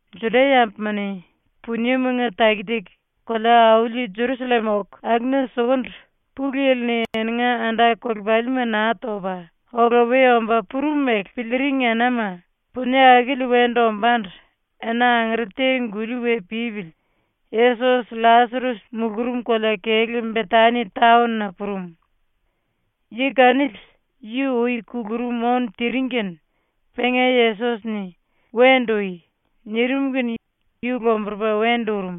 ⸤Juda-yambuma-ni puniemanga taki-taki kolea-auli Jerusallem oku akuna sukundu⸥ Pulu Yili-ni eninga anda-kolepalima Naa Topa Ola We Omba Purum mele piliiring enama punie akili wendu ombándu ena angere te-guli we pípili Yesos LLasares mulurum kolea-kelú Betani taon-na purum. Yi kanili yu ui kulurum ónu tiring kene penga Yesos-ni “Wendu ui.” nirim kene yu lomburupa wendu urum.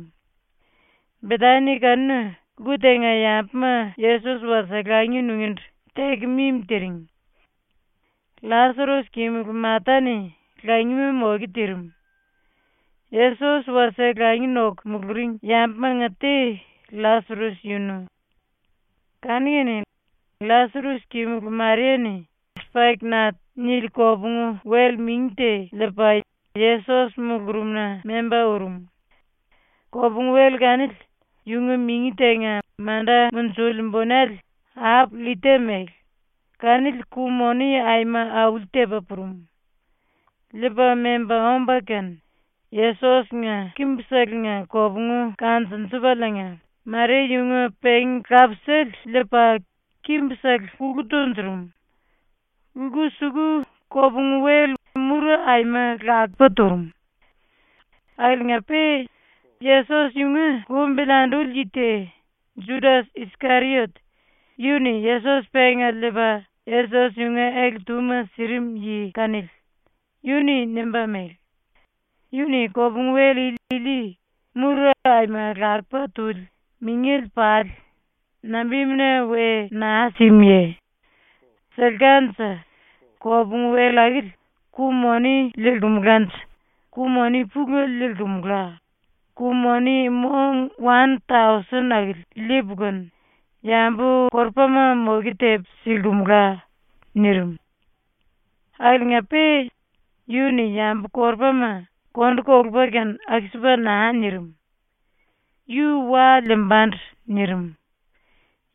Betani kanuna lku tenga yambuma Yesos wasie langi nungíndu teku mimi tiring. LLasares kimulu Mata-ni langima moke tirim. Yesos wasie langi noku muluring yambumanga te LLasares yunu. Kanu-kene LLasares kimulu Maria-ni ‘sipaik-nat’ nili kopungu-wel mingi te liipa Yesos mulurumna memba urum. Kopungu-wel kanili yunga mingi tenga manda munjili bunele ap-llita mele, kanili ku-moni aima auli-tepa purum. Liipa memba omba kene, Yesos-nga kimbuselenga kopungu kanjunjupaliinga Maria yunga pengi-lapisale liipa kimbusele kulu tunjurum. Lku-suku kopungu-wel mura aima lakupa turum. Akiliinga-pe Yesos yunga lumbili anduli yi te, Judas-Iskeriot, yu-ni Yesos penga liipa Yesos yunga ele-túma sirim yi kanili, yu-ni nimba mele: “⸤Yu-ni kopungu-wel ili mura aima lakupa tuli mingele pali nambimuna we naa simuye? Silkanje⸥ kopungu-wel akili ku-moni liilkumulanje ku-moni pulele liilkumula, ku-moni mong wan-tausen akili liipu kene yambu-korupama moke tepu silkimula.” nirim. Akiliinga-pe yu-ni yambu-korupama kondu kolupa kene aku-sipa naa nirim. Yu wa liimbandu nirim.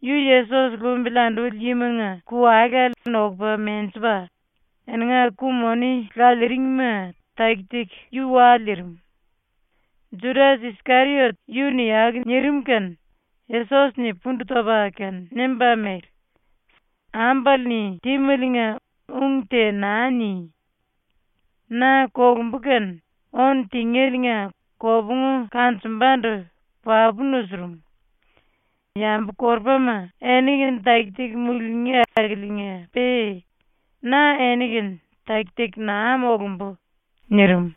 Yu Yesos lumbili anduli yimanga ku-walale nokupa menjipa, eninga ku-moni laliiringma taki-taki yu wa liirim. ⸤Judas-Iskeriot yu-ni aku nirim kene⸥ Yesos-ni pundu topa kene nimba mele: “Ambale-ni tímeliinga ung te naa ni! Na kolumbu kene ónu tingéliinga kopungu kanjumbandu papu nusurum. Yambu-korupama eni-kene taki-taki mulungí akiliinga-pe na eni-kene taki-taki naa molumbu.” nirim.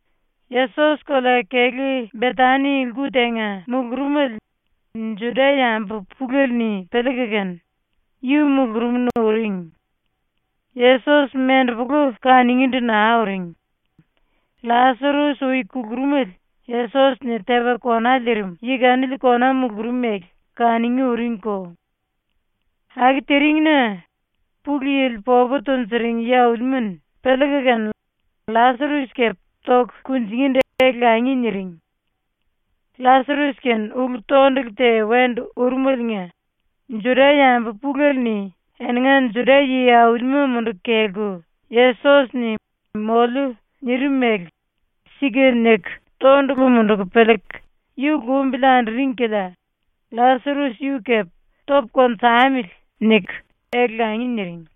Yesos kolea-kelú Betani lku tenga mulurumele Juda-yambu pulele-ni piliiku kene yu mulurumna uring. Yesos mendepolu kanungíndu naa uring. LLasares ui kulurumele Yesos-ni tepa kona liirim yi kanili kona mulurum mele kanungí uringko. Aku tiring-na Pulu Yili popu tunjuring yi-aulima-ni piliiku kene LLasares kepe toku kunjingíndu ele-langi niring. LLasares-kene ulu-tondulu te wendu urumeliinga Juda-yambu pulele-ni eninga Juda yi-aulima munduku kelku Yesos-ni “moliu.” nirim mele ‘Sika’ niku tondulu munduku piliiku yu lumbili anduring kilia LLasares yu kepe “Topu konjamili.” niku ele-langi niring.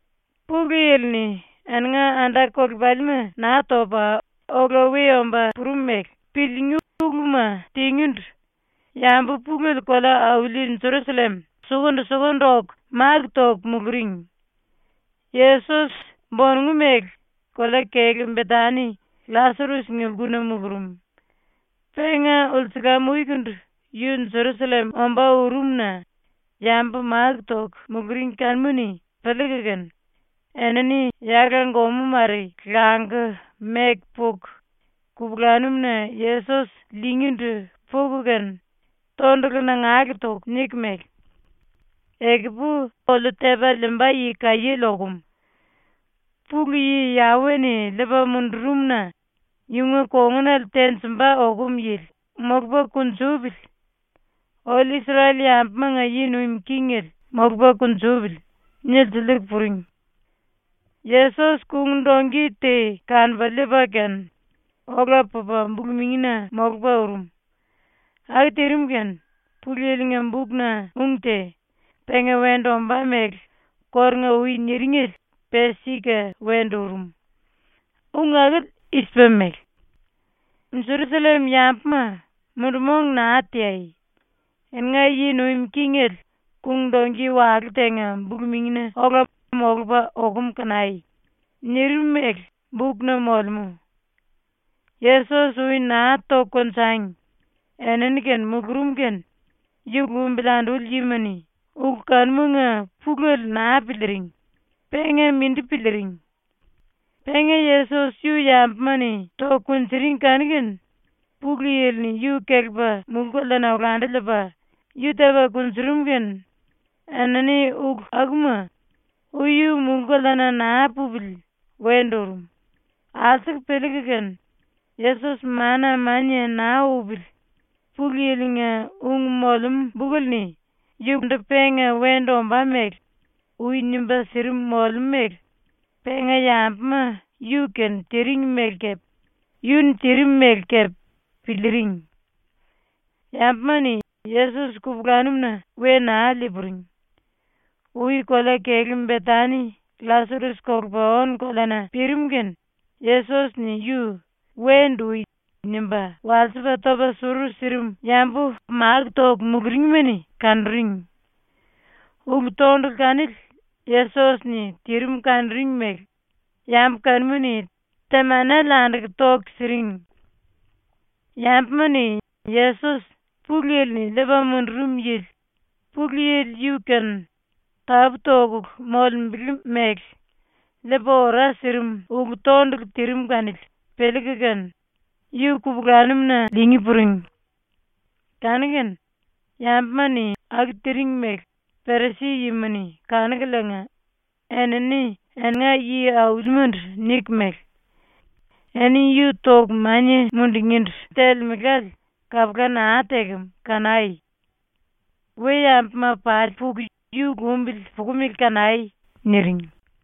⸤Pulu Yili-ni eninga anda-kolepalima Naa Topa Ola We Omba Purum mele⸥ piliingí uluma tingíndu yambu pulele kolea-auli Jerusallem sukundu-sukundu oku máku toku muluring. Yesos ⸤bonongu mele kolea-kelú Betani LLasares-nga lkuna mulurum.⸥ Penga ulsulam-ukundu yu Jerusallem ombá urum-na yambu máku toku muluring kanuma-ni piliiku kene, enini yala-gomú mare languku meku puku, kupulanum-na Yesos liingíndu puku kene tondulu nangale toku niku mele: “Ekupu oliu tepa liimba yi kaiéle okum. Pulu Yi Yawe-ni liipa mundurum-na yunga kongunale tenjimba okum yili molupa kunjupili. ⸤Oliu⸥ Isrel-yambumanga yi nuim kingele molupa kunjupili.” nilsiliiku puring. Yesos kung-dongki te kanupa liipa kene ola pupa bulu-mingina molupa ⸤urum⸥. Aku tirim kene Pulu Yili-nga bukna ung te, penga wendu ombá mele kórunga-ui niringele, pe sika wendu urum. Ung akili i-sipa mele: ‘Jerusallem-yambuma, mundu-mong naa teai. Eninga yi nuim kingele kung-dongki walú tenga bulu-mingina ola molupa okum kanai.’ nirim mele bukna molemú. Yesos ui naa toku konjangi enini-kene mulurum kene yu lumbili anduli yima-ni ulu kanumanga pulele naa piliiring, penga mindi piliiring. Penga Yesos yu yambuma-ni toku kunjuring kanu-kene Pulu Yili-ni yu kelepa mulú-koleana olandu liipa yu tepa kunjurum kene enini ulu akuma, ui yu mulú-koleana naa pupili wendu urum, alsuku piliiku kene, Yesos mana-mania naa upili Pulu Yili-nga ung molemú bukele-ni yundu penga wendu ombá mele ui nimba sirim molemú mele penga yambuma yu-kene tiring mele kepe yu-ni tirim mele kepe piliiring. Yambuma-ni Yesos kupulanum-na we naa lii-puring. Ui kolea-kelú Betani LLasares kolupa ónu-koleana pirim kene Yesos-ni yu “Wendu ui!” nimba walsipa topa suru sirim yambu máku toku muluringma-ni kanuring. Ulu-tondulu kanili Yesos-ni tirim kanuring mele yambu kanuma-ni temanele anduku toku siring. Yambuma-ni Yesos Pulu Yili-ni liipa mundurum yili, Pulu Yili yu-kene tapú-tokulu molembele mele liipa ora sirim ulu-tondulu tirim kanili piliiku kene yu kupulanum-na liingí puring. Kanu-kene yambuma-ni aku tiring mele Perisi-yima-ni kanukuliinga enini eninga yi-aulimandu niku mele: “Eni yu toku mania mundungíndu telemelále kapula naa tekem kanai. we-yambuma pali puku yu lumbili pukumele kanai.” niring.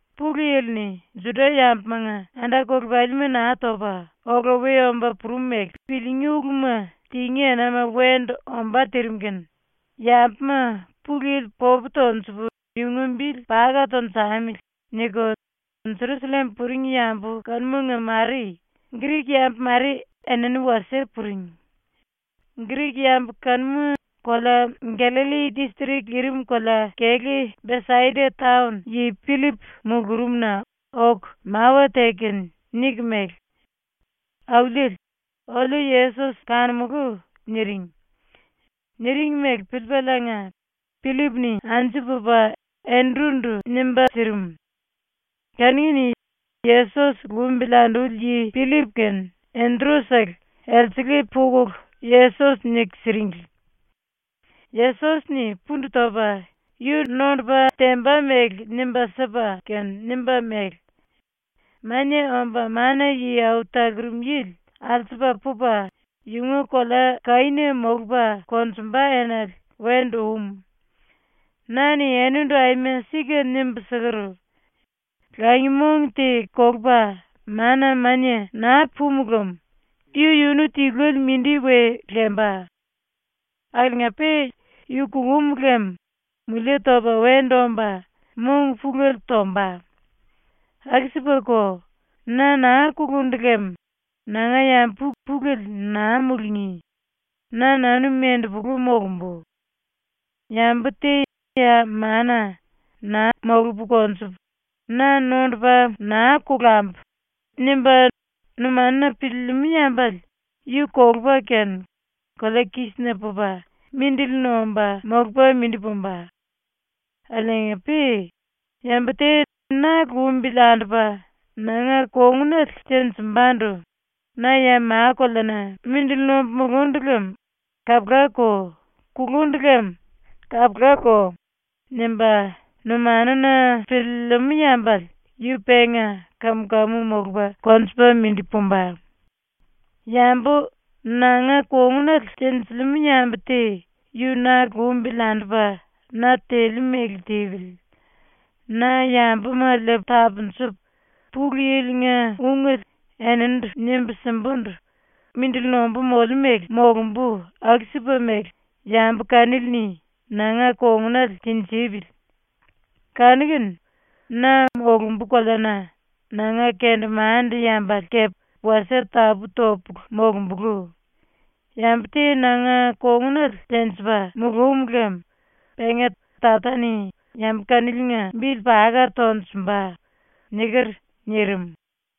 ⸤Pulu Yili-ni Juda-yambumanga anda-kolepalima Naa Topa Ola We Omba Purum mele⸥ piliingí uluma tingí enama wendu ombá tirim kene yambuma ‘Pulu Yili popu tonjupu yunga bili paka tunjamili.’ niku Jerusallem puring yambu kanumanga mare Grik-yambu mare enini wasie puring. Grik-yambu kanuma kolea Gallalli distrik lirim kolea-kelú Besaida taon yi Pillip mulurumna oku mawa teku kene niku mele: “Auliele, oliu Yesos kanumulú.” niring. Niring mele piliipaliinga Pillip-ni anju pupa Endru-ndu nimba sirim. Kanu-kene Yesos lumbili anduli yi Pillip kene Endru-sele elsele pukulu Yesos niku siringli. Yesos-ni pundu topa yu nondupa temba mele nimba sipa kene nimba mele: “Mania Omba Mana-Yi Au Talurum Yili alsupa pupa yunga kolea-kaína molupa konjumba enale wendu um. Na-ni enindu aima sika nimbu siker: “Langi-mong te kolupa mana-mania naa pumu lem yu-yunu tiluele mindi we lemba. Akiliinga-pe yu kulum lem mulie topa wendu omba mong pulele tomba. ⸤Aku-sipako na naa kulundu lem nanga yambu pulele naa mulungí, na-nanu mendepulu molumbu.⸥ “Yambu te ya mana ‘Na molupu konjupu, na nondupa naa kolambu.’ nimba numanuna piliilimú yambale yu kolupa kene kolea-kísina pupa mindili nomba molupa mindi pumba. Akiliinga-pe yambu te na lumbili andupa nanga kongunale tenjimbandu ‘Na ya ma-koleana mindili nombu mulundu lem kapulako, kulundu lem kapulako.’ nimba numanuna piliilimú yambale yu penga kam-kamu molupa konjupa mindi pumba. Yambu nanga kongunale tenjilimú yambu te yu na lumbili andupa na teliu mele tipili. Na yambuma liipu tapunjupu, Pulu Yili-nga ungele eninindu nimbu simbundu mindili nombu moliu mele molumbu aku-sipa mele yambu kanili-ni nanga kongunale tinjipili. Kanu-kene na molumbu koleana nanga kendemande-yambale kepe wasie tapú-topulu molombulú. Yambu te nanga kongunale tenjipa mulúm lem penga Tata-ni yambu kaniliinga bili paka tonjumba.” niker.” ⸤nirim.⸥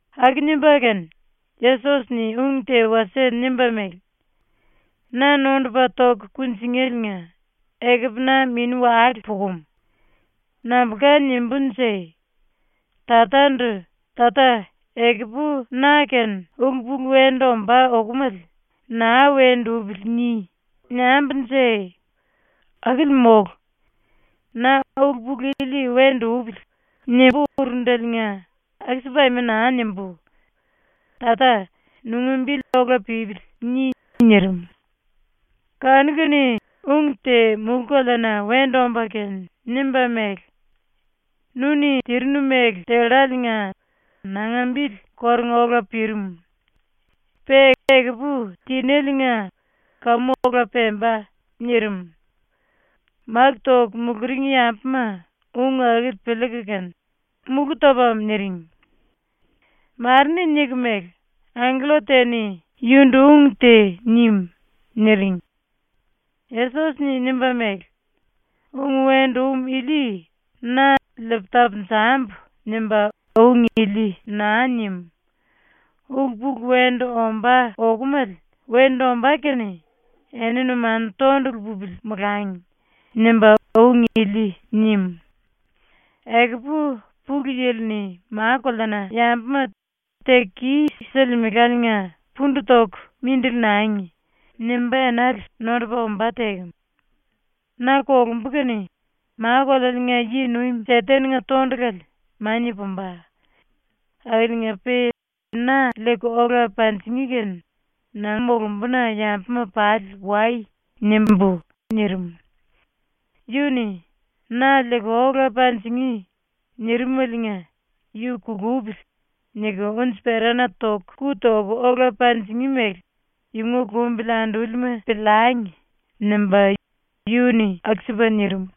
⸤Aku nimba kene Yesos-ni ung te wasie nimba mele:⸥ “⸤Na nondupa toku kunjingéliinga⸥ ekupu na mini-wale pukumu. Nambulka nimbúnje? Tatandu “Tata, ekupu na-kene ulu-pulu wendu ombá okomale ‘Naa wendu upili.’ ni.” niambunje? Akili mólu! Na ‘ulu-pulu ili wendu upili.’ nimbu urundeliinga aku-sipu aima naa nimbú. Tata, nunga bili ‘Ola pípili.’ ni.” nirim. Kanu-kene ung te mulú-koleana wendu omba kene nimba mele: “Nu-ni tirinu mele telláliinga nanga bili kórunga ola pirim. Pe ekupu tinéliinga kamu ola pemba.” nirim. Máku toku muluring yambuma ung akili piliiku kene, “Mulú topam.” niring. Mare-ni niku mele: “Angkella te-ni yundu ung te nim.” niring. Yesos-ni nimba mele: “Ung wendu um ili na ‘Liipu tapunjambu.’ nimba ung ili naa nim. ‘Ulu-pulu wendu ombá okomale wendu ombá kene eni numanu tondulu pupili molangi.’ nimba ung ili nim. Ekupu Pulu Yili-ni ma-koleana yambuma “Teku kis-silimelaliinga pundu toku mindili nangi.” nimba enale nondupa ombá tekem. Na kolumbu kene ma-kolealiinga ⸤yi-⸥nuim ⸤Seten⸥nga tondulale mania pumba. Akiliinga-pe na liiku ola panjingí kene na molumbuna yambuma pali “Wai.” nimbú.” nirim. (Yu-ni “Na liiku ola panjingí.” nirimaliinga ‘ ‘Yu kulupili.’ niku unji-perana ⸤toku⸥ ku toku ola panjingí mele yunga lumbili andúlima piliangi.’ nimba yu-ni aku-sipa nirim.)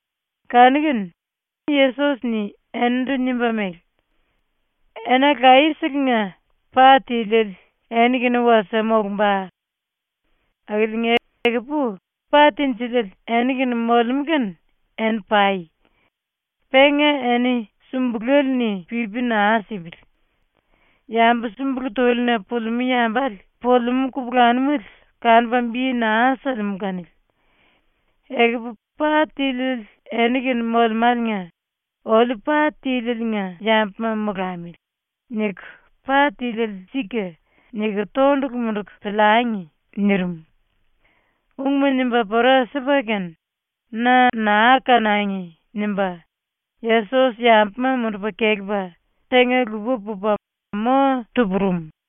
Kanu-kene Yesos-ni eninindu nimba mele: “Ena laye-selenga pa tiliele eni-kene wasie molumba. Akiliinga ekupu pa tinjiliele eni-kene molemú kene eni pai. Penga eni sumbulele-ni pipi naa sipili. Yambu súmbulu túlina pulimú yambale pulimú kupulanumele kanupa bi naa silimú kanili. Ekupu pa tiliele eni-kene molemáliinga ‘Oliu pa tílieliinga yambuma molamili.’ niku ‘Pa tíliele sika.’ niku tondulu munduku piliangi.” nirim. Ungma nimba pora sipa kene, ‘Na naa kanangi.’ nimba Yesos yambuma mundupa kelepa tenga-lupa pupa mo tu-purum.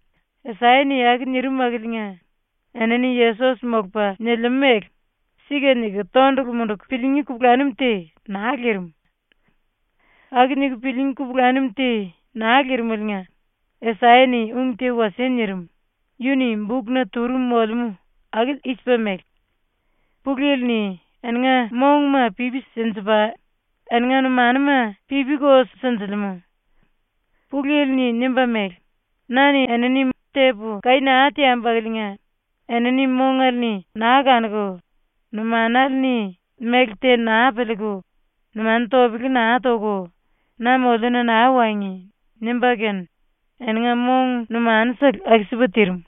Asaya-ni aku nirim akiliinga enini Yesos molupa nilimú mele ‘Sika’ niku tondulu munduku piliingí kupulanum te naa lirim. Aku niku piliingí kupulanum te naa lirimeliinga Asaya-ni ung te wasie nirim, yu-ni bukna turum molemú, akili i-sipa mele: “Pulu Yili-ni eninga monguma pipi sinjipa, eninga numanuma pipiko sinjilimú. Pulu Yili-ni nimba mele: “Na-ni enini tepu kaí naa teambu akiliinga enini mongale-ni naa kanuku, numanale-ni méle te naa piliiku, numanu topele naa toku na moliuna naa wangi.” nimba kene eninga mong numanusele aku-sipa tirim.”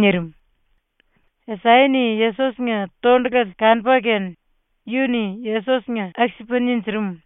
nirim. Asaya-ni Yesos-nga tondulale kanupa kene yu-ni Yesos-nga aku-sipa ninjirim.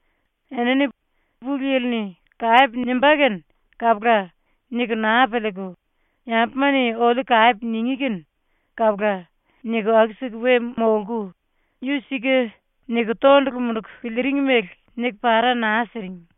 Enini ‘Pulu Yili-ni kape nimbá kene kapula.’ niku naa piliiku, ‘Yambuma-ni oliu kape ningí kene kapula.’ niku aku-siku we molku, yu ‘Sika’ niku tondulu munduku piliiring mele niku para naa siring.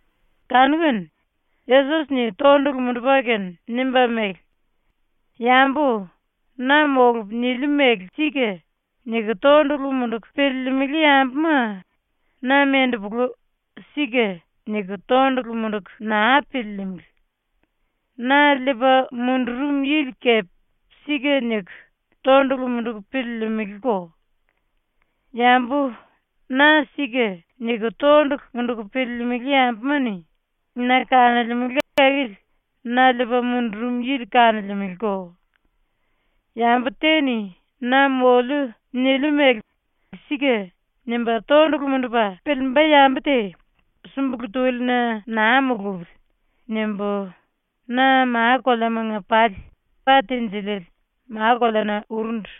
Kanu-kene Yesos-ni tondulu mundupa kene nimba mele: “Yambu ‘Na molupu niliu mele sika.’ niku tondulu munduku piliilimili yambuma na mendepulu ‘Sika’ niku tondulu munduku naa piliilimili. Na liipa mundurum yili kepe ‘Sika’ niku tondulu munduku piliilimiliko. Yambu ‘Na sika.’ niku tondulu munduku piliilimili yambuma-ni na kanolemele akili na liipa mundurum yili kanolemeleko. ‘Yambu te-ni ‘Na moliu niliu mele sika.’ nimba tondulu mundupa piliimba yambu te súmbulu túlina naa mulupili.’ nimbu na ma-koleamanga pali pa tinjiliele ma-koleana urundu.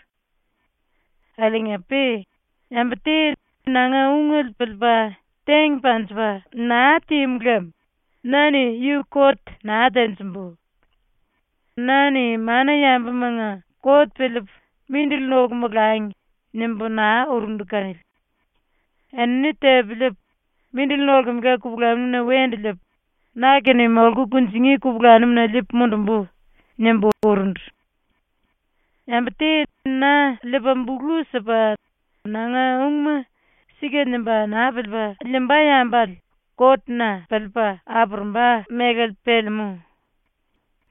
“Akiliinga-pe yambu te nanga ungele piliipa teng panjipa naa tímu lem na-ni yu kot naa tenjimbu. Na-ni mana-yambumanga kot piliipu ‘mindili noku molangi.’ nimbu naa urundu kanili. ‘Enini tepu liipu, mindili nolkemela kupulanum-na wendu liipu, na-kene molku kunjingí kupulanum-na liipu monjumbu.’ nimbu urundu. Yambu te na liipa bulu sipa nanga ungma ‘Sika’ nimba naa piliipa liimba yambale kot-na piliipa apurumba mélale pelemú.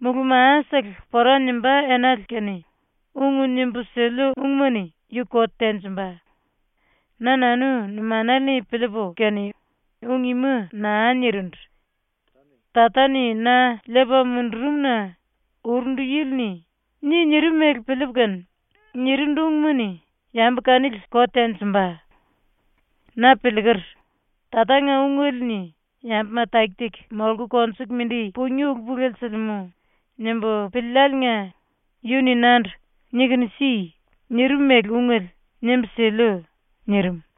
Mulú-masele pora nimbá enale kene ung nimbu siliu ungma-ni yu kot tenjimba. Na-nanu numanale-ni piliipu kene ung ima naa nirindu. Tata-ni na liipa mundurum-na urundu yili-ni “Ni.” nirim mele piliipu kene, nirindu ungma-ni yambu kanili kot tenjimba. Na piliiker, ‘Tatanga ungele-ni yambuma taki-taki molku konjuku mindi pungí ulu-pulele silimú.’ nimbu piliiliáliinga yu-ni nandu “Nikunu si.” nirim mele ungele nimbu siliu.” nirim.